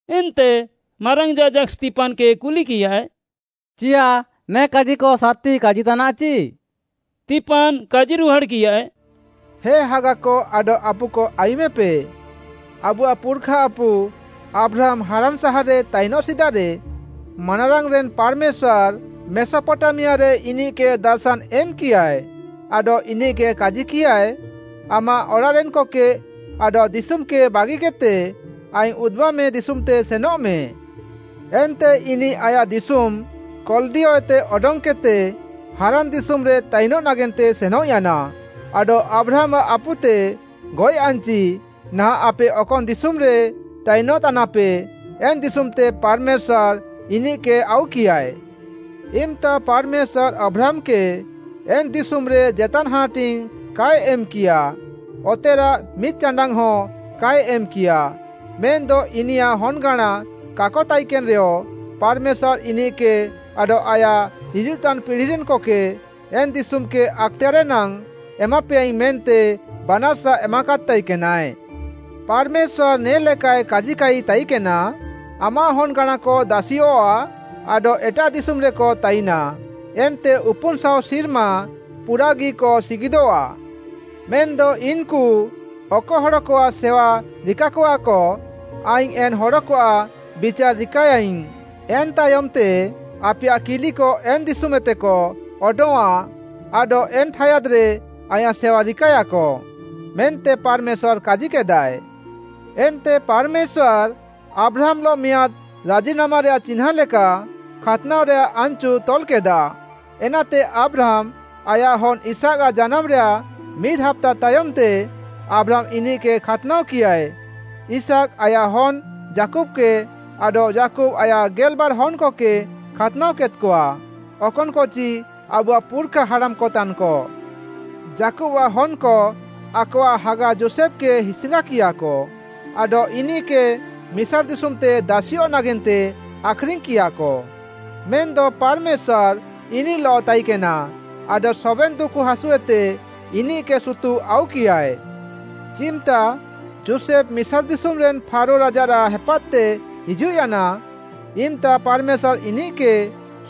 ଏନ୍ତେ ମାରାଙ୍ଗ୍‌ ଯାଜାକ୍‌ ସ୍ତିଫାନ୍‌କେ କୁଲିକିୟାଏ, “ଚିୟାଃ ନେ କାଜିକ ସାର୍‌ତି କାଜିତାନାଃଚି?” ସ୍ତିଫାନ୍‌ କାଜିରୁହାଡ଼୍‌କିୟାଏ, “ହେ ହାଗାକ ଆଡଃ ଆପୁକ ଆୟୁମେପେ! ଆବୁଆଃ ପୁର୍‌ଖା ଆପୁ ଆବ୍ରାହାମ୍‌ ହାରାନ୍‌ ସାହାର୍‌ରେ ତାଇନଃ ସିଦାରେ, ମାନାରାଙ୍ଗ୍‌ରେନ୍‌ ପାର୍‌ମେଶ୍ୱାର୍‌ ମେସପଟାମିଆରେ ଇନିଃକେ ଦାର୍‌ଶାନ୍‌ ଏମ୍‌କିୟାଏ, ଆଡଃ ଇନିଃକେ କାଜିକିୟାଏ, ‘ଆମାଃ ଅଡ଼ାଃରେନ୍‌କକେ ଆଡଃ ଦିଶୁମ୍‌କେ ବାଗିକେଦ୍‌ତେ ଆଇଙ୍ଗ୍‌ ଉଦୁବାମେ ଦିଶୁମ୍‌ତେ ସେନଃମେ।’ ଏନ୍ତେ ଇନିଃ ଆୟାଃ ଦିଶୁମ୍‌ କଲ୍‌ଦିୟଏତେ ଅଡଙ୍ଗ୍‌କେଦ୍‌ତେ ହାରାନ୍‌ ଦିଶୁମ୍‌ରେ ତାଇନଃ ନାଗେନ୍ତେ ସେନଃୟାନା, ଆଡଃ ଆବ୍ରାହାମ୍‌ଆଃ ଆପୁତେ ଗଏଃୟାନ୍‍ଚି ନାହାଁଃ ଆପେ ଅକନ୍‌ ଦିଶୁମ୍‌ରେ ତାଇନଃତାନାପେ, ଏନ୍‌ ଦିଶୁମ୍‌ତେ ପାର୍‌ମେଶ୍ୱାର୍‌ ଇନିଃକେ ଆଉକିୟାଏ। ଇମ୍‌ତା ପାର୍‌ମେଶ୍ୱାର୍‌ ଆବ୍ରାହାମ୍‌କେ ଏନ୍‌ ଦିଶୁମ୍‌ରେ ଜେତାନ୍ ହାନାଟିଙ୍ଗ୍‌ କାଏ ଏମ୍‌କିୟା, ଅତେରାଃ ମିଦ୍‍ଚାଣ୍ଡାଙ୍ଗ୍‌ହଁ କାଏ ଏମ୍‌କିୟା, ମେନ୍‌ଦ ଇନିୟାଃ ହନ୍‌ଗାଁଣା କାକ ତାଇକେନ୍‌ରେୟ ପାର୍‌ମେଶ୍ୱାର୍‌ ଇନିଃକେ ଆଡଃ ଆୟାଃ ହିଜୁଃତାନ୍‌ ପିଢ଼ିରେନ୍‌କକେ ଏନ୍‌ ଦିଶୁମ୍‌କେ ଆକ୍‌ତେୟାର୍‌ରେ ନାଙ୍ଗ୍‌ ଏମାପେୟାଇଙ୍ଗ୍‌ ମେନ୍ତେ ବାନାର୍‌ସା ଏମାକାଦ୍‌ ତାଇକେନାଏ। ପାର୍‌ମେଶ୍ୱାର୍‌ ନେ'ଲେକାଏ କାଜିକାଇ ତାଇକେନା, ‘ଆମାଃ ହନ୍‍ଗାଁଣାକ ଦାସିୟଃଆ ଆଡଃ ଏଟାଃ ଦିଶୁମ୍‌ରେକ ତାଇନା ଏନ୍ତେ ଉପୁନ୍‌ ଶାଅ ସିର୍ମା ପୁରାଃଗିକ ସିଗିଦଃଆ। ମେନ୍‌ଦ ଇନ୍‌କୁ ଅକ ହଡ଼କଆଃ ସେୱା ରିକାକଆକ, ଆଇଙ୍ଗ୍‌ ଏନ୍‌ ହଡ଼କଆଃ ବିଚାର୍‌ ରିକାଏୟାଇଙ୍ଗ୍‌, ଏନ୍‌ତାୟମ୍‌ତେ ଆପେୟାଃ କିଲିକ ଏନ୍‌ ଦିଶୁମ୍‌ଏତେକ ଅଡଙ୍ଗ୍‌ଆଁ ଆଡଃ ନେ ଠାୟାଦ୍‌ରେ ଆଇଁୟାଃ ସେୱା ରିକାଏୟାକ।’ ମେନ୍ତେ ପାର୍‌ମେଶ୍ୱାର୍‌ କାଜିକେଦାଏ। ଏନ୍ତେ ପାର୍‌ମେଶ୍ୱାର୍‌, ଆବ୍ରାହାମ୍‌ଲଃ ମିଆଁଦ୍‌ ରାଜିନାମାରେୟାଃ ଚିହ୍ନାଁ ଲେକା ଖାତ୍‍ନାଅରେୟାଃ ଆନ୍‌ଚୁ ତଲ୍‌କେଦା। ଏନାତେ ଆବ୍ରାହାମ୍‌, ଆୟାଃ ହନ୍‌ ଇସାକ୍‌ଆଃ ଜାନାମ୍‌ରେୟାଃ ମିଦ୍‌ ହାପ୍ତା ତାୟମ୍‌ତେ ଆବ୍ରାହାମ୍‌ ଇନିଃକେ ଖାତ୍‌ନାଅକିୟାଏ, ଇସାକ୍‌ ଆୟାଃ ହନ୍‌ ଯାକୁବ୍‌କେ ଆଡଃ ଯାକୁବ୍‌ ଆୟାଃ ଗେଲ୍‌ବାର୍‌ ହନ୍‌କକେ ଖାତ୍‌ନାଅକେଦ୍‌କଆ, ଅକନ୍‌କଚି ଆବୁଆଃ ପୁର୍‌ଖା ହାଡ଼ାମ୍‌କତାନ୍‌କ। “ଯାକୁବ୍‌ଆଃ ହନ୍‌କ ଆକଆଃ ହାଗା ଯୋଷେଫ୍‌କେ ହିସ୍‌ଙ୍ଗାକିୟାକ ଆଡଃ ଇନିଃକେ ମିସାର୍‌ ଦିଶୁମ୍‌ତେ ଦାସିୟଃ ନାଗେନ୍ତେ ଆଖ୍‌ରିଙ୍ଗ୍‌କିୟାକ। ମେନ୍‌ଦ ପାର୍‌ମେଶ୍ୱାର୍‌ ଇନିଃଲଃ ତାଇକେନା, ଆଡଃ ସବେନ୍‌ ଦୁକୁ ହାସୁଏତେ ଇନିଃକେ ସୁତୁଃ ଆଉକିୟାଏ। ଚିମ୍‌ତା ଯୋଷେଫ୍‌ ମିସାର୍‌ ଦିଶୁମ୍‌ରେନ୍‌ ଫାରୋ ରାଜାରାଃ ହେପାଦ୍‌ତେ ହିଜୁଃୟାନା, ଇମ୍‌ତା ପାର୍‌ମେଶ୍ୱାର୍‌ ଇନିଃକେ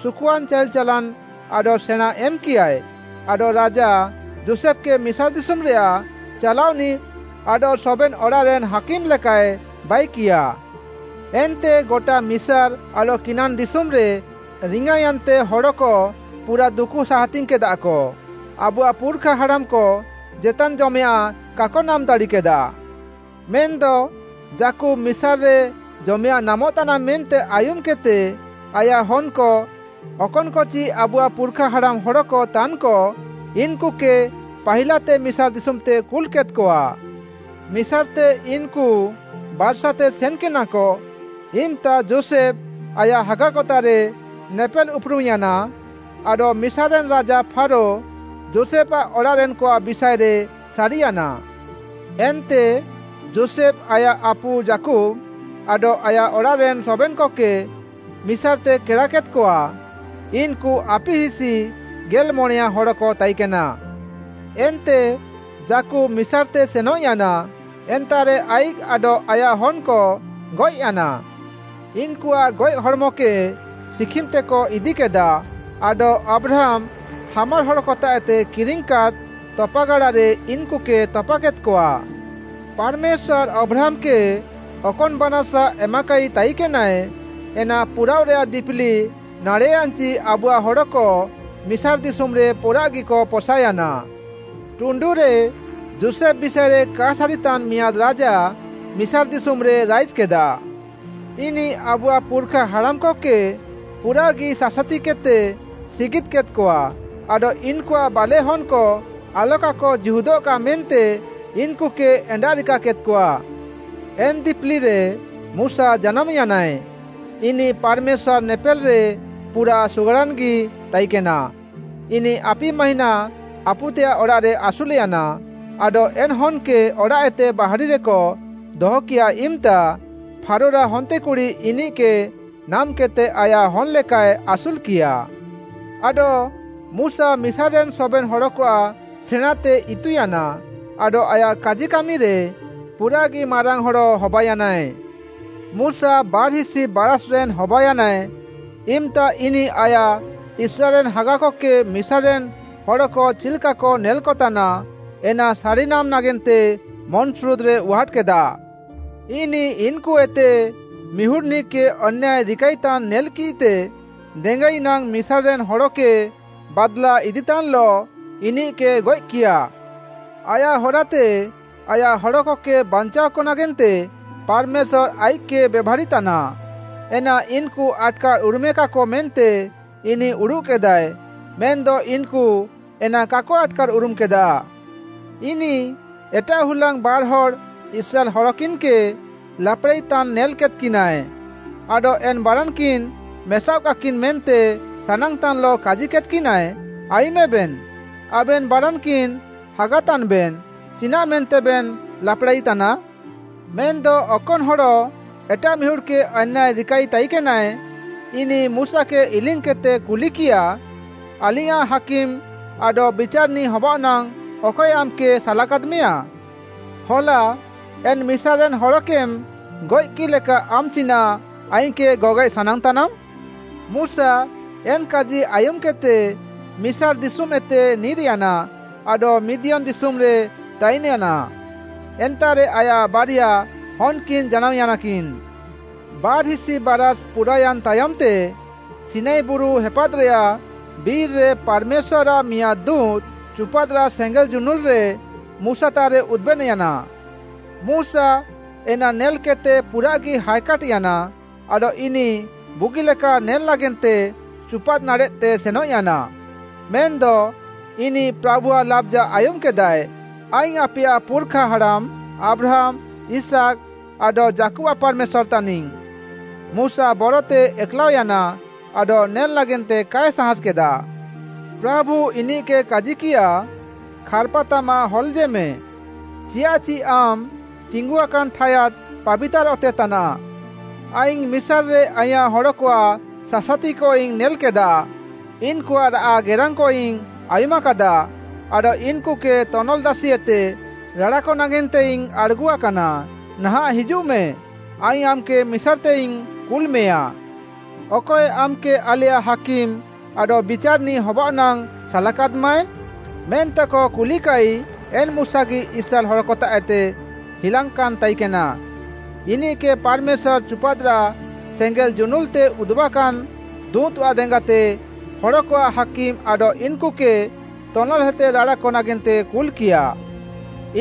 ସୁକୁଆନ୍‌ ଚାଇଲ୍‌ ଚାଲାନ୍‌ ଆଡଃ ସେଣାଁଁ ଏମ୍‌କିୟାଏ, ଆଡଃ ରାଜା, ଯୋଷେଫ୍‌କେ ମିସାର୍‌ ଦିଶୁମ୍‌ରେୟାଃ ଚାଲାଅନିଃ ଆଡଃ ସବେନ୍‌ ଅଡ଼ାଃରେନ୍‌ ହାକିମ୍‌ ଲେକାଏ ବାଇକିୟା। ଏନ୍ତେ ଗଟା ମିସାର୍‌ ଆଡଃ କିନାନ୍‌ ଦିଶୁମ୍‌ରେ ରିଙ୍ଗାୟାନ୍‌ତେ ହଡ଼କ ପୁରାଃ ଦୁକୁ ସାହାତିଙ୍ଗ୍‌କେଦାକ। ଆବୁଆଃ ପୁର୍‌ଖା ହାଡ଼ାମ୍‌କ ଜେତାନ୍‌ ଜମେୟାଁଃ କାକ ନାମ୍‌ ଦାଡ଼ିକେଦା। ମେନ୍‌ଦ ଯାକୁବ୍‌ ମିସାର୍‍ରେ ଜମେୟାଁଃ ନାମଃତାନା ମେନ୍ତେ ଆୟୁମ୍‌କେଦ୍‌ତେ, ଆୟାଃ ହନ୍‌କ, ଅକନ୍‌କଚି ଆବୁଆଃ ପୁର୍‌ଖାହାଡ଼ାମ୍‌ ହଡ଼କ ତାନ୍‌କ, ଇନ୍‌କୁକେ ପାହିଲାତେ ମିସାର୍‌ ଦିଶୁମ୍‌ତେ କୁଲ୍‍କେଦ୍‍କଆ। ମିସାର୍‌ତେ ଇନ୍‌କୁ ବାର୍‌ସାତେ ସେନ୍‌କେନାକ ଇମ୍‌ତା ଯୋଷେଫ୍‌ ଆୟାଃ ହାଗାକତାଃରେ ନେପେଲ୍‌ ଉପୁରୁମ୍‌ୟାନା ଆଡଃ ମିସାର୍‌ରେନ୍‌ ରାଜା ଫାରୋ ଯୋଷେଫ୍‌ଆଃ ଅଡ଼ାଃରେନ୍‌କଆଃ ବିଷାଏରେ ସାରିୟାନା। ଏନ୍ତେ ଯୋଷେଫ୍‌ ଆୟାଃ ଆପୁ ଯାକୁବ୍‌ ଆଡଃ ଆୟାଃ ଅଡ଼ାଃରେନ୍‌ ସବେନ୍‌କକେ ମିସାର୍‌ତେ କେଡ଼ାକେଦ୍‍କଆ, ଇନ୍‌କୁ ଆପିହିସି ଗେଲ୍‌ମଣେୟାଁ ହଡ଼କ ତାଇକେନା। ଏନ୍ତେ ଯାକୁବ୍‌ ମିସାର୍‌ତେ ସେନଃୟାନା, ଏନ୍ତାଃରେ ଆଇଃକ୍‌ ଆଡଃ ଆୟାଃ ହନ୍‌କ ଗଏଃୟାନା। ଇନ୍‌କୁଆଃ ଗଏଃ ହଡ଼୍‌ମକେ ଶିଖିମ୍‌ତେକ ଇଦିକେଦା ଆଡଃ ଆବ୍ରାହାମ୍‌, ହାମର୍‌ ହଡ଼କତାଃଏତେ କିରିଙ୍ଗ୍‌କାଦ୍‌ ତପାଗାଡ଼ାରେ ଇନ୍‌କୁକେ ତପାକେଦ୍‍କଆ। “ପାର୍‌ମେଶ୍ୱାର୍‌ ଆବ୍ରାହାମ୍‌କେ ଅକନ୍‌ ବାନାର୍‌ସା ଏମାକାଇ ତାଇକେନାଏ, ଏନା ପୁରାଅଃରେୟାଃ ଦିପିଲି ନାଡ଼େଃୟାନ୍‌ଚି ଆବୁଆଃ ହଡ଼କ ମିସାର୍‌ ଦିଶୁମ୍‌ରେ ପୁରାଃଗିକ ପସାୟାନା। ଟୁଣ୍ଡୁରେ ଯୋଷେଫ୍‌ ବିଷାଏରେ କାଏ ସାରିତାନ୍‌ ମିଆଁଦ୍‌ ରାଜା ମିସାର୍‌ ଦିଶୁମ୍‌ରେ ରାଇଜ୍‌କେଦା। ଇନିଃ ଆବୁଆଃ ପୁର୍‌ଖା ହାଡ଼ାମ୍‌କକେ ପୁରାଃଗି ସାସାତିକେଦ୍‌ତେ ସିଗିଦ୍‌କେଦ୍‌କଆ ଆଡଃ ଇନ୍‌କୁଆଃ ବାଲେଃହନ୍‌କ ଆଲକାକ ଜୀହୁଦଃକା ମେନ୍ତେ ଇନ୍‌କୁକେ ଏଣ୍ଡାଃରିକାକେଦ୍‌କଆ। ଏନ୍‌ ଦିପିଲିରେ ମୁଶା ଜାନାମ୍‌ୟାନାଏ, ଇନିଃ ପାର୍‌ମେଶ୍ୱାର୍‌ ନେପେଲ୍‌ରେ ପୁରାଃ ସୁଗାଡ଼ାନ୍‌ଗି ତାଇକେନା। ଇନିଃ ଆପି ମାହିଁନା ଆପୁତେୟାଃ ଅଡ଼ାଃରେ ଆସୁଲ୍‍ୟାନା, ଆଡଃ ଏନ୍‌ ହନ୍‌କେ ଅଡ଼ାଃଏତେ ବାହାରିରେକ ଦହକିୟା ଇମ୍‌ତା, ଫାରୋରାଃ ହନ୍ତେକୁଡ଼ି ଇନିଃକେ ନାମ୍‌କେଦ୍‌ତେ ଆୟାଃ ହନ୍‌ ଲେକାଏ ଆସୁଲ୍‍କିୟା। ଆଡଃ ମୁଶା ମିସାର୍‌ରେନ୍‌ ସବେନ୍‌ ହଡ଼କଆଃ ସେଣାଁଁତେ ଇତୁୟାନା ଆଡଃ ଆୟାଃ କାଜି କାମିରେ ପୁରାଃଗି ମାରାଙ୍ଗ୍‌ ହଡ଼ ହବାୟାନାଏ। “ମୁଶା ବାର୍‌ହିସି ବାରାଷ୍‌ରେନ୍‌ ହବାୟାନାଏ, ଇମ୍‌ତା ଇନିଃ ଆୟାଃ ଇସ୍ରାଏଲ୍‌ରେନ୍‌ ହାଗାକକେ ମିସାର୍‌ରେନ୍‌ ହଡ଼କ ଚିଲ୍‌କାକ ନେଲ୍‌କତାନା, ଏନା ସାରିନାମ୍‌ ନାଗେନ୍ତେ ମନ୍‌ସୁରୁଦ୍‌ରେ ଉହାଟ୍‌କେଦା। ଇନିଃ ଇନ୍‌କୁଏତେ ମିହୁଡ଼୍‌ନିଃକେ ଅନ୍ୟାୟ ରିକାଇତାନ୍‌ ନେଲ୍‌କିଃତେ ଦେଙ୍ଗାଇ ନାଙ୍ଗ୍‌ ମିସାର୍‌ରେନ୍‌ ହଡ଼କେ ବାଦ୍‌ଲା ଇଦିତାନ୍‌ଲଃ ଇନିଃକେ ଗଏଃକିୟା। ଆୟାଃ ହରାତେ ଆୟାଃ ହଡ଼କକେ ବାଞ୍ଚାଅକ ନାଗେନ୍ତେ ପାର୍‌ମେଶ୍ୱାର୍‌ ଆଇଃକ୍‌କେ ବେଭାରିତାନା, ଏନା ଇନ୍‌କୁ ଆଟ୍‌କାର୍‌ ଉରୁମେକାକ ମେନ୍ତେ ଇନିଃ ଉଡ଼ୁଃକେଦାଏ, ମେନ୍‌ଦ ଇନ୍‌କୁ ଏନା କାକ ଆଟ୍‌କାର୍‌ ଉରୁମ୍‌କେଦା। ଇନିଃ ଏଟାଃ ହୁଲାଙ୍ଗ୍‌ ବାର୍‌ହଡ଼୍‌ ଇସ୍ରାଏଲ୍‌ ହଡ଼କିନ୍‌କେ ଲାପ୍‌ଡ଼ାଇତାନ୍ ନେଲ୍‌କେଦ୍‌କିନାଏ, ଆଡଃ ଏନ୍‌ ବାରାନ୍‌କିନ୍‌ ମେସାଅଃକାକିନ୍‌ ମେନ୍ତେ ସାନାଙ୍ଗ୍‌ତାନ୍‌ଲଃ କାଜିକେଦ୍‌କିନାଏ, ‘ଆୟୁମେବେନ୍‌, ଆବେନ୍‌ ବାରାନ୍‌କିନ୍‌ ହାଗାତାନ୍‌ବେନ୍‌ ଚିନାଃମେନ୍ତେବେନ୍‌ ଲାପ୍‌ଡ଼ାଇତାନା?’ ମେନ୍‌ଦ ଅକନ୍‌ ହଡ଼ ଏଟାଃ ମିହୁଡ଼୍‌କେ ଅନ୍ୟାୟ ରିକାଇ ତାଇକେନାଏ, ଇନିଃ ମୁଶାକେ ଇଲିଙ୍ଗ୍‌କେଦ୍‌ତେ କୁଲିକିୟା, ‘ଆଲିଙ୍ଗ୍‌ୟାଁଃ ହାକିମ୍‌ ଆଡଃ ବିଚାର୍‌ନିଃ ହବାଅଃ ନାଙ୍ଗ୍‌ ଅକଏ ଆମ୍‌କେ ସାଲାକାଦ୍‌ମେୟାଁ?’ ‘ହଲା ଏନ୍‌ ମିସାର୍‌ରେନ୍‌ ହଡ଼କେମ୍‌ ଗଏଃକିଃ ଲେକା ଆମ୍‌ ଚିନାଃ ଆଇଙ୍ଗ୍‌କେ ଗଗଏଃ ସାନାଙ୍ଗ୍‌ତାନାମ୍‌?’ ମୁଶା ଏନ୍‌ କାଜି ଆୟୁମ୍‌କେଦ୍‌ତେ, ମିସାର୍‌ ଦିଶୁମ୍‌ଏତେ ନିର୍‌ୟାନା ଆଡଃ ମିଦିୟନ୍‌ ଦିଶୁମ୍‌ରେ ତାଇନ୍‌ୟାନା। ଏନ୍ତାଃରେ ଆୟାଃ ବାରିଆ ହନ୍‌କିନ୍‌ ଜାନାମ୍‌ୟାନା। “ବାର୍‍ହିସି ବାରାଷ୍‌ ପୁରାୟାନ୍‌ ତାୟମ୍‌ତେ, ସିନାଇ ବୁରୁ ହେପାଦ୍‌ରେୟାଃ ବିର୍‌ରେ ପାର୍‌ମେଶ୍ୱାର୍‌ଆଃ ମିଆଁଦ୍‌ ଦୁଁତ୍‌ ଚୁପାଦ୍‌ରାଃ ସେଙ୍ଗେଲ୍ ଜୁନୁଲ୍‍ରେ ମୁଶାତାଃରେ ଉଦୁବେନ୍‌ୟାନା। ମୁଶା ଏନା ନେଲ୍‍କେଦ୍‌ତେ ପୁରାଃଗି ହାଏକାଟ୍‍ୟାନା ଆଡଃ ଇନିଃ ବୁଗିଲେକା ନେଲେ ନାଗେନ୍ତେ ଚୁପାଦ୍‌ ନାଡ଼େଃତେ ସେନଃୟାନା। ମେନ୍‌ଦ ଇନିଃ ପ୍ରାଭୁଆଃ ଲାବ୍‌ଜା ଆୟୁମ୍‌କେଦାଏ, ‘ଆଇଙ୍ଗ୍‌ ଆପେୟାଃ ପୁର୍‌ଖା ହାଡ଼ାମ୍‌ ଆବ୍ରାହାମ୍‌, ଇସାକ୍‌, ଆଡଃ ଯାକୁବ୍‌ଆଃ ପାର୍‌ମେଶ୍ୱାର୍‌ ତାନିଙ୍ଗ୍‌।’ ମୁଶା ବରତେ ଏକ୍‌ଲାଅୟାନା ଆଡଃ ନେଲ୍‌ ନାଗେନ୍ତେ କାଏ ସାହାସ୍‌କେଦା। ପ୍ରାଭୁ ଇନିଃକେ କାଜିକିୟା, ‘ଖାର୍‌ପାତାମାଃ ହଲେଜେମେ, ଚିୟାଃଚି ଆମ୍‌ ତିଙ୍ଗୁଆକାନ୍‌ ଠାୟାଦ୍ ପାବିତାର୍‌ ଅତେ ତାନାଃ। ଆଇଙ୍ଗ୍‌ ମିସାର୍‍ରେ ଆଇଁୟାଃ ହଡ଼କଆଃ ସାସାତିକଇଙ୍ଗ୍‌ ନେଲାକାଦା। ଇନ୍‌କୁଆଃ ରାଆଃ ଗେରାଙ୍ଗ୍‌କଇଙ୍ଗ୍‌ ଆୟୁମ୍‌କାଦା ଆଡଃ ଇନ୍‌କୁକେ ତନଲ୍‌ଦାସିଏତେ ରାଡ଼ାକ ନାଗେନ୍ତେଇଙ୍ଗ୍‌ ଆଡ଼୍‌ଗୁଆକାନା। ନାହାଁଃ ହିଜୁଃମେ, ଆଇଙ୍ଗ୍‌ ଆମ୍‌କେ ମିସାର୍‌ତେଇଙ୍ଗ୍‌ କୁଲ୍‌ମେୟାଁ।’ “‘ଅକଏ ଆମ୍‌କେ ଆଲେୟାଃ ହାକିମ୍‌ ଆଡଃ ବିଚାର୍‌ନିଃ ହବାଅଃ ନାଙ୍ଗ୍‌ ସାଲାକାଦ୍‌ମାଏ?’ ମେନ୍ତେକ କୁଲିକାଇ ଏନ୍‌ ମୁଶାଗି ଇସ୍ରାଏଲ୍‌ ହଡ଼କତାଃଏତେ ହିଲାଙ୍ଗ୍‌କାନ୍‌ ତାଇକେନା। ଇନିଃକେ ପାର୍‌ମେଶ୍ୱାର୍‌ ଚୁପାଦ୍‌ରାଃ ସେଙ୍ଗେଲ୍‌ ଜୁନୁଲ୍‌ତେ ଉଦୁବାକାନ୍‌ ଦୁଁତ୍‌ଆଃ ଦେଙ୍ଗାତେ ହଡ଼କଆଃ ହାକିମ୍‌ ଆଡଃ ଇନ୍‌କୁକେ ତନଲ୍‌ଏତେ ରାଡ଼ାକ ନାଗେନ୍ତେ କୁଲ୍‌କିୟା।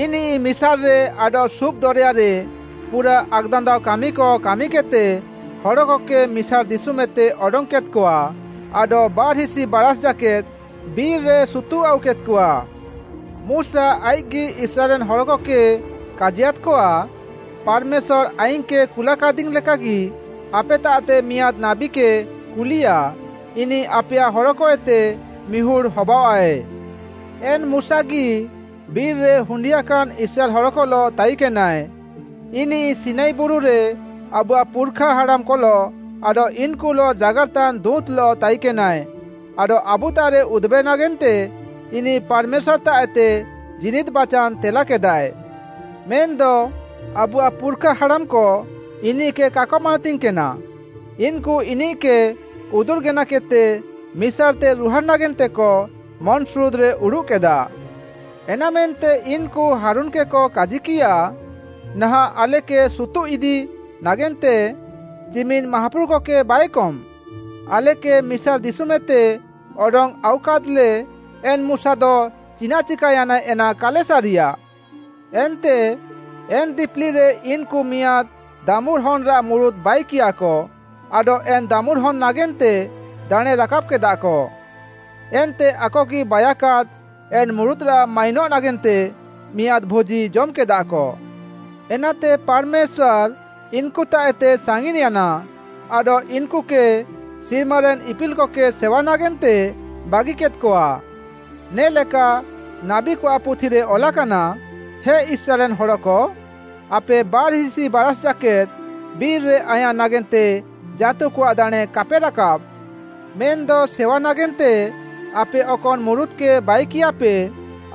ଇନିଃ ମିସାର୍‌ରେ ଆଡଃ ସୁଫ୍‌ ଦରେୟାରେ ପୁରାଃ ଆକ୍‌ଦାନ୍ଦାଅ କାମିକ କାମିକେଦ୍‌ତେ ହଡ଼କକେ ମିସାର୍‌ ଦିଶୁମ୍‌ଏତେ ଅଡଙ୍ଗ୍‌କେଦ୍‌କଆ, ଆଡଃ ବାର୍‌ହିସି ବାରାଷ୍‌ ଜାକେଦ୍‌ ବିର୍‌ରେ ସୁତୁଃ ଆଉକେଦ୍‌କଆ। ମୁଶା ଆଇଃକ୍‌ଗି ଇସ୍ରାଏଲ୍‌ରେନ୍‌ ହଡ଼କକେ କାଜିୟାଦ୍‌କଆ, ‘ପାର୍‌ମେଶ୍ୱାର୍‌ ଆଇଙ୍ଗ୍‌କେ କୁଲାକାଦିଙ୍ଗ୍‌ ଲେକାଗି, ଆପେତାଃତେ ମିଆଁଦ୍‌ ନାବୀକେ କୁଲିୟା, ଇନିଃ ଆପେୟାଃ ହଡ଼କଏତେ ମିହୁଡ଼୍‌ ହବାଅଃଆଏ।’ ଏନ୍‌ ମୁଶାଗି ବିର୍‍ରେ ହୁଣ୍ଡିୟାକାନ୍‌ ଇସ୍ରାଏଲ୍‌ ହଡ଼କଲଃ ତାଇକେନାଏ। ଇନିଃ ସିନାଇ ବୁରୁରେ ଆବୁଆଃ ପୁର୍‌ଖା ହାଡ଼ାମ୍‌କଲଃ ଆଡଃ ଇନ୍‌କୁଲଃ ଜାଗାର୍‌ତାନ୍‌ ଦୁଁତ୍‌ଲଃ ତାଇକେନାଏ ଆଡଃ ଆବୁତାଃରେ ଉଦୁବେ ନାଗେନ୍ତେ ଇନିଃ ପାର୍‌ମେଶ୍ୱାର୍‌ତାଃଏତେ ଜୀନିଦ୍‌ ବାଚାନ୍‌ ତେଲାକେଦାଏ। “ମେନ୍‌ଦ ଆବୁଆଃ ପୁର୍‌ଖା ହାଡ଼ାମ୍‌କ ଇନିଃକେ କାକ ମାନାତିଙ୍ଗ୍‌କେନା, ଇନ୍‌କୁ ଇନିଃକେ ଉଦୁର୍‌ ଗେନାକେଦ୍‌ତେ ମିସାର୍‌ତେ ରୁହାଡ଼୍‌ ନାଗେନ୍ତେକ ମନ୍‌ସୁରୁଦ୍‌ରେ ଉଡ଼ୁଃକେଦା। ଏନାମେନ୍ତେ ଇନ୍‌କୁ ହାରୁନ୍‌କେକ କାଜିକିୟା, ‘ନାହାଁଃ ଆଲେକେ ସୁତୁଃ ଇଦି ନାଗେନ୍ତେ ଚିମିନ୍‌ ମାହାପୁରୁକକେ ବାଇକମ୍‌। ଆଲେକେ ମିସାର୍‌ ଦିଶୁମ୍‌ଏତେ ଅଡଙ୍ଗ୍‌ ଆଉକାଦ୍‌ଲେ ଏନ୍‌ ମୁଶାଦ ଚିନାଃ ଚିକାୟାନାଏ ଏନା କାଲେ ସାରିୟା।’ ଏନ୍ତେ ଏନ୍‌ ଦିପିଲିରେ ଇନ୍‌କୁ ମିଆଁଦ୍‌ ଦାମୁର୍‌ହନ୍‌ରାଃ ମୁରୁତ୍‌ ବାଇକିୟାକ ଆଡଃ ଏନ୍‌ ଦାମୁର୍‌ହନ୍‌ ନାଗେନ୍ତେ ଦାଣେଁ ରାକାବ୍‍କେଦାକ। ଏନ୍ତେ ଆକଗି ବାଇୟାକାଦ୍‌ ଏନ୍‌ ମୁରୁତ୍‌ରାଃ ମାଇନଃ ନାଗେନ୍ତେ ମିଆଁଦ୍‌ ଭୋଜି ଜମ୍‌କେଦାକ। ଏନାତେ ପାର୍‌ମେଶ୍ୱାର୍‌ ଇନ୍‍କୁତାଃଏତେ ସାଙ୍ଗିନ୍‌ୟାନା ଆଡଃ ଇନ୍‌କୁକେ ସିର୍ମାରେନ୍‌ ଇପିଲ୍‌କକେ ସେୱା ନାଗେନ୍ତେ ବାଗିକେଦ୍‌କଆ। ନେ'ଲେକା ନାବୀକଆଃ ପୁଥିରେ ଅଲାକାନା, “‘ହେ ଇସ୍ରାଏଲ୍‌ରେନ୍‌ ହଡ଼କ, ଆପେ ବାର୍‍ହିସି ବାରାଷ୍‌ ଜାକେଦ୍‌ ବିର୍‌ରେ ଆଇଁୟାଃ ନାଗେନ୍ତେ ଜାଁତୁକଆଃ ଦାଣେଁ କାପେ ରାକାବ୍‌। ମେନ୍‌ଦ ସେୱା ନାଗେନ୍ତେ ଆପେ ଅକନ୍‌ ମୁରୁତ୍‌କେ ବାଇକିୟାପେ,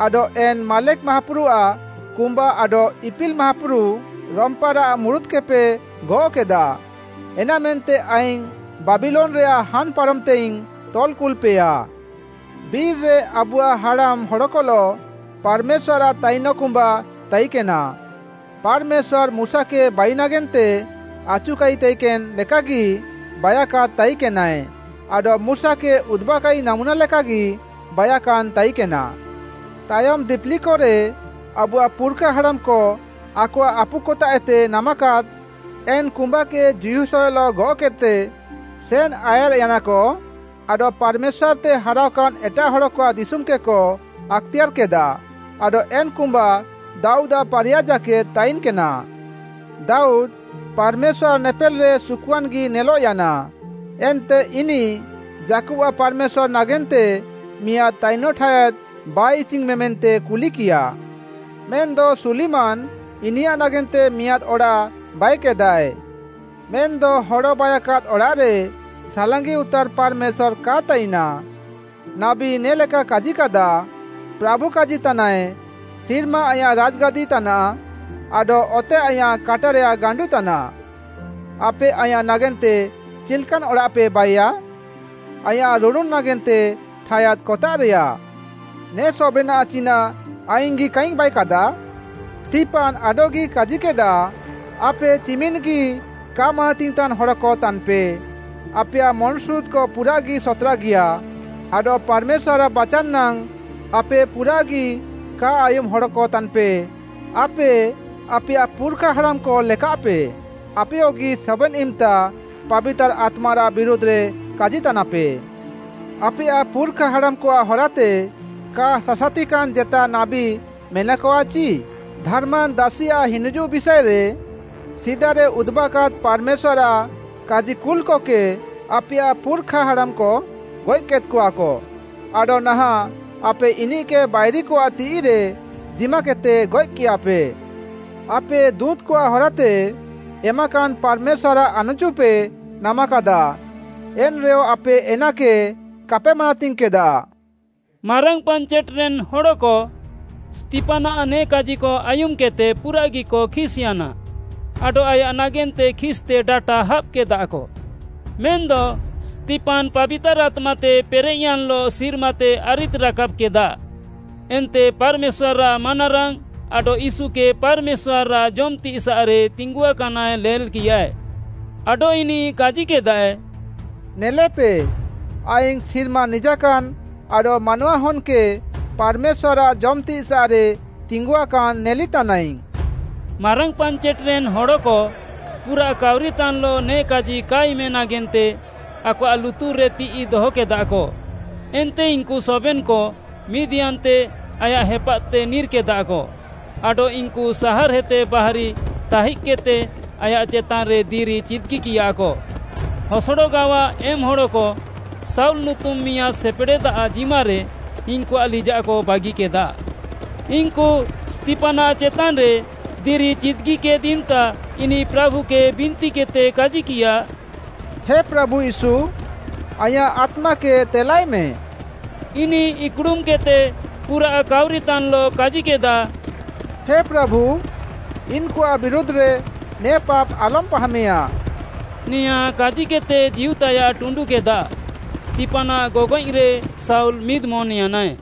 ଆଡଃ ଏନ୍‌ ମାଲେଖ୍‌ ମାହାପୁରୁଆଃ କୁମ୍ବା ଆଡଃ ଇପିଲ୍‌ ମାହାପୁରୁ, ରମ୍ପାରାଃ ମୁରୁତ୍‌କେପେ ଗଅଃକେଦା। ଏନାମେନ୍ତେ ଆଇଙ୍ଗ୍‌ ବାବିଲୋନ୍‌ରେୟାଃ ହାନ୍‌ ପାରମ୍‌ତେଇଙ୍ଗ୍‌ ତଲ୍‌ କୁଲ୍‌ପେୟା।’ “ବିର୍‌ରେ ଆବୁଆଃ ହାଡ଼ାମ୍‌ ହଡ଼କଲଃ ପାର୍‌ମେଶ୍ୱାର୍‌ଆଃ ତାଇନଃ କୁମ୍ବା ତାଇକେନା। ପାର୍‌ମେଶ୍ୱାର୍‌, ମୁଶାକେ ବାଇ ନାଗେନ୍ତେ ଆଚୁକାଇ ତାଇକେନ୍‌ ଲେକାଗି ବାଇୟାକାଦ୍‌ ତାଇକେନାଏ ଆଡଃ ମୁଶାକେ ଉଦୁବାକାଇ ନାମୁନା ଲେକାଗି ବାଇୟାକାନ୍‌ ତାଇକେନା। ତାୟମ୍‌ ଦିପିଲିକରେ ଆବୁଆଃ ପୁର୍‌ଖା ହାଡ଼ାମ୍‌କ ଆକଆଃ ଆପୁକତାଃଏତେ ନାମାକାଦ୍‌, ଏନ୍‌ କୁମ୍ବାକେ ଯିହୋଶୁୟଲଃ ଗଅଃକେଦ୍‌ତେ ସେନ୍‌ ଆୟାର୍‌ୟାନାକ ଆଡଃ ପାର୍‌ମେଶ୍ୱାର୍‌ତେ ହାରାଅକାନ୍‌ ଏଟାଃ ହଡ଼କଆଃ ଦିଶୁମ୍‌କେକ ଆକ୍‌ତେୟାର୍‌କେଦା। ଆଡଃ ଏନ୍‌ କୁମ୍ବା ଦାଉଦ୍‌ଆଃ ପାରିୟା ଜାକେଦ୍‌ ତାଇନ୍‌କେନା। ଦାଉଦ୍‌, ପାର୍‌ମେଶ୍ୱାର୍‌ଆଃ ନେପେଲ୍‌ରେ ସୁକୁଆନ୍‌ଗି ନେଲଃୟାନା, ଏନ୍ତେ ଇନିଃ ଯାକୁବ୍‌ଆଃ ପାର୍‌ମେଶ୍ୱାର୍‌ ନାଗେନ୍ତେ ମିଆଁଦ୍‌ ତାଇନଃ ଠାୟାଦ୍‌ ବାଇ ଇଚିଇଙ୍ଗ୍‌ମେ ମେନ୍ତେ କୁଲିକିୟା। ମେନ୍‌ଦ ସୁଲିମାନ୍‌ ଇନିୟାଃ ନାଗେନ୍ତେ ମିଆଁଦ୍‌ ଅଡ଼ାଃ ବାଇକେଦାଏ। “ମେନ୍‌ଦ ହଡ଼ ବାଇୟାକାଦ୍‌ ଅଡ଼ାଃରେ ସାଲାଙ୍ଗି ଉତାର୍‌ ପାର୍‌ମେଶ୍ୱାର୍‌ କାଏ ତାଇନା। ନାବୀ ନେ ଲେକାଏ କାଜିକାଦା, “ପ୍ରାଭୁ କାଜିତାନାଏ, ‘ସିର୍ମା ଆଇଁୟାଃ ରାଜ୍‌ଗାଦି ତାନାଃ, ଆଡଃ ଅତେ ଆଇଁୟାଃ କାଟାରେୟାଃ ଗାଣ୍ଡୁ ତାନାଃ। ଆପେ ଆଇଁୟାଃ ନାଗେନ୍ତେ ଚିଲ୍‌କାନ୍ ଅଡ଼ାଃପେ ବାଇୟା? ଆଇଁୟାଃ ରୁଡ଼ୁନ୍‌ ନାଗେନ୍ତେ ଠାୟାଦ୍‌ କତାଃରେୟା? ନେ ସବେନାଃ ଚିନାଃ ଆଇଙ୍ଗ୍‌ଗି କାଇଙ୍ଗ୍‌ ବାଇୟାକାଦା?’ “ସ୍ତିଫାନ୍‌ ଆଡଃଗି କାଜିକେଦା, ଆପେ ଚିମିନ୍‌ଗି କା ମାନାତିଙ୍ଗ୍‌ତାନ୍‌ ହଡ଼କ ତାନ୍‌ପେ! ଆପେୟାଃ ମନ୍‌ସୁରୁଦ୍‌କ ପୁରାଃଗି ସତ୍‌ରାଗିୟା ଆଡଃ ପାର୍‌ମେଶ୍ୱାର୍‌ଆଃ ବାଚାନ୍‌ ନାଙ୍ଗ୍‌ ଆପେ ପୁରାଃଗି କା ଆୟୁମ୍‌ ହଡ଼କ ତାନ୍‌ପେ! ଆପେ ଆପେୟାଃ ପୁର୍‌ଖା ହାଡ଼ାମ୍‌କ ଲେକାଃପେ, ଆପେୟଗି ସବେନ୍‌ ଇମ୍‌ତା ପାବିତାର୍‌ ଆତ୍ମାରାଃ ବିରୁଧ୍‌ରେ କାଜିତାନାପେ। ଆପେୟାଃ ପୁର୍‌ଖା ହାଡ଼ାମ୍‌କଆଃ ହରାତେ କା ସାସାତିକାନ୍‌ ଜେତା ନାବୀ ମେନାକଆ ଚି? ଧାର୍‌ମାନ୍ ଦାସିଆଃ ହିନିଜୁଃ ବିଷାଏରେ, ସିଦାରେ ଉଦୁବାକାଦ୍‌ ପାର୍‌ମେଶ୍ୱାର୍‌ଆଃ କାଜିକୁଲ୍‌କକେ ଆପେୟାଃ ପୁର୍‌ଖା ହାଡ଼ାମ୍‌କ ଗଏଃକେଦ୍‌କଆକ। ଆଡଃ ନାହାଁଃ ଆପେ ଇନିଃକେ ବାଇରିକଆଃ ତିଃଇରେ ଜିମାକେଦ୍‌ତେ ଗଏଃକିୟାପେ। ଆପେ ଦୁଁତ୍‌କଆଃ ହରାତେ ଏମାକାନ୍‌ ପାର୍‌ମେଶ୍ୱାର୍‌ଆଃ ଆନ୍‌ଚୁପେ ନାମାକାଦା, ଏନ୍‌ରେୟ ଆପେ ଏନାକେ କାପେ ମାନାତିଙ୍ଗ୍‌କେଦା।” ମାରାଙ୍ଗ୍‌ ପାଞ୍ଚେଟ୍‌ରେନ୍‌ ହଡ଼କ ସ୍ତିଫାନ୍‌ଆଃ ନେ କାଜିକ ଆୟୁମ୍‌କେଦ୍‌ତେ ପୁରାଃଗିକ ଖିସ୍‌ୟାନା ଆଡଃ ଆୟାଃ ନାଗେନ୍ତେ ଖିସ୍‌ତେ ଡାଟା ହାବ୍‌କେଦାକ। ମେନ୍‌ଦ ସ୍ତିଫାନ୍‌ ପାବିତାର୍‌ ଆତ୍ମାତେ ପେରେଃୟାନ୍‌ଲଃ ସିର୍ମାତେ ଆରିଦ୍‍ରାକାବ୍‍କେଦା ଏନ୍ତେ ପାର୍‌ମେଶ୍ୱାର୍‌ଆଃ ମାନାରାଙ୍ଗ୍‌ ଆଡଃ ୟୀଶୁକେ ପାର୍‌ମେଶ୍ୱାର୍‌ଆଃ ଜମ୍‌ତିସାଃରେ ତିଙ୍ଗୁଆକାନାଏ ନେଲ୍‌କିୟା। ଆଡଃ ଇନିଃ କାଜିକେଦାଏ, “ନେଲେପେ, ଆଇଙ୍ଗ୍‌ ସିର୍ମା ନିଜାକାନ୍‌ ଆଡଃ ମାନୱାହନ୍‌କେ ପାର୍‌ମେଶ୍ୱାର୍‌ଆଃ ଜମ୍‍ତିସାଃରେ ତିଙ୍ଗୁଆକାନ୍‌ ନେଲିତାନାଇଙ୍ଗ୍‌।” ମାରାଙ୍ଗ୍‌ ପାଞ୍ଚେଟ୍‌ରେନ୍‌ ହଡ଼କ ପୁରାଃ କାଉରିତାନ୍‌ଲଃ ନେ କାଜି କା ଆୟୁମେ ନାଗେନ୍ତେ ଆକଆଃ ଲୁତୁର୍‌ରେ ତିଃଇ ଦହକେଦାକ। ଏନ୍ତେ ଇନ୍‌କୁ ସବେନ୍‌କ ମିଦ୍‌ୟାନ୍ତେ ଆୟାଃ ହେପାଦ୍‌ତେ ନିର୍‌କେଦାକ, ଆଡଃ ଇନ୍‌କୁ ସାହାର୍‌ହେତେ ବାହାରି ଥାଇଜ୍‌କେଦ୍‌ତେ ଆୟାଃ ଚେତାନ୍‌ରେ ଦିରି ଚିଦ୍‌ଗିକିୟାକ। ହସଡ଼ ଗାୱା ଏମ୍‌ ହଡ଼କ ଶାଉଲ୍‌ ନୁତୁମ୍‌ ମିଆଁଦ୍‌ ସେପେଡ଼େଦ୍‌ଆଃ ଜିମାରେ ଇନ୍‌କୁଆଃ ଲିଜାଃକ ବାଗିକେଦା। ଇନ୍‌କୁ ସ୍ତିଫାନ୍‌ଆଃ ଚେତାନ୍‌ରେ ଦିରି ଚିଦ୍‌ଗିକେଦ୍‌ ଇମ୍‌ତା ଇନିଃ ପ୍ରାଭୁକେ ବିନ୍ତିକେଦ୍‌ତେ କାଜିକିୟା, “ହେ ପ୍ରାଭୁ ୟୀଶୁ, ଆଇଁୟାଃ ଆତ୍ମାକେ ତେଲାଏମେ।” ଇନିଃ ଇକ୍‌ଡ଼ୁମ୍‌କେଦ୍‌ତେ ପୁରାଃ କାଉରିତାନ୍‌ଲଃ କାଜିକେଦା, “ହେ ପ୍ରାଭୁ, ଇନ୍‌କୁଆଃ ବିରୁଧ୍‌ରେ ନେ ପାପ୍‌ ଆଲମ୍‌ ପାହେମେୟା।” ନେୟାଁ କାଜିକେଦ୍‌ତେ ଜୀଉତାୟାଃ ଟୁଣ୍ଡୁକେଦା। ସ୍ତିଫାନ୍‌ଆଃ ଗଗଏଃରେ ଶାଉଲ୍‌ ମିଦ୍‌ମନ୍‌ୟାନାଏ।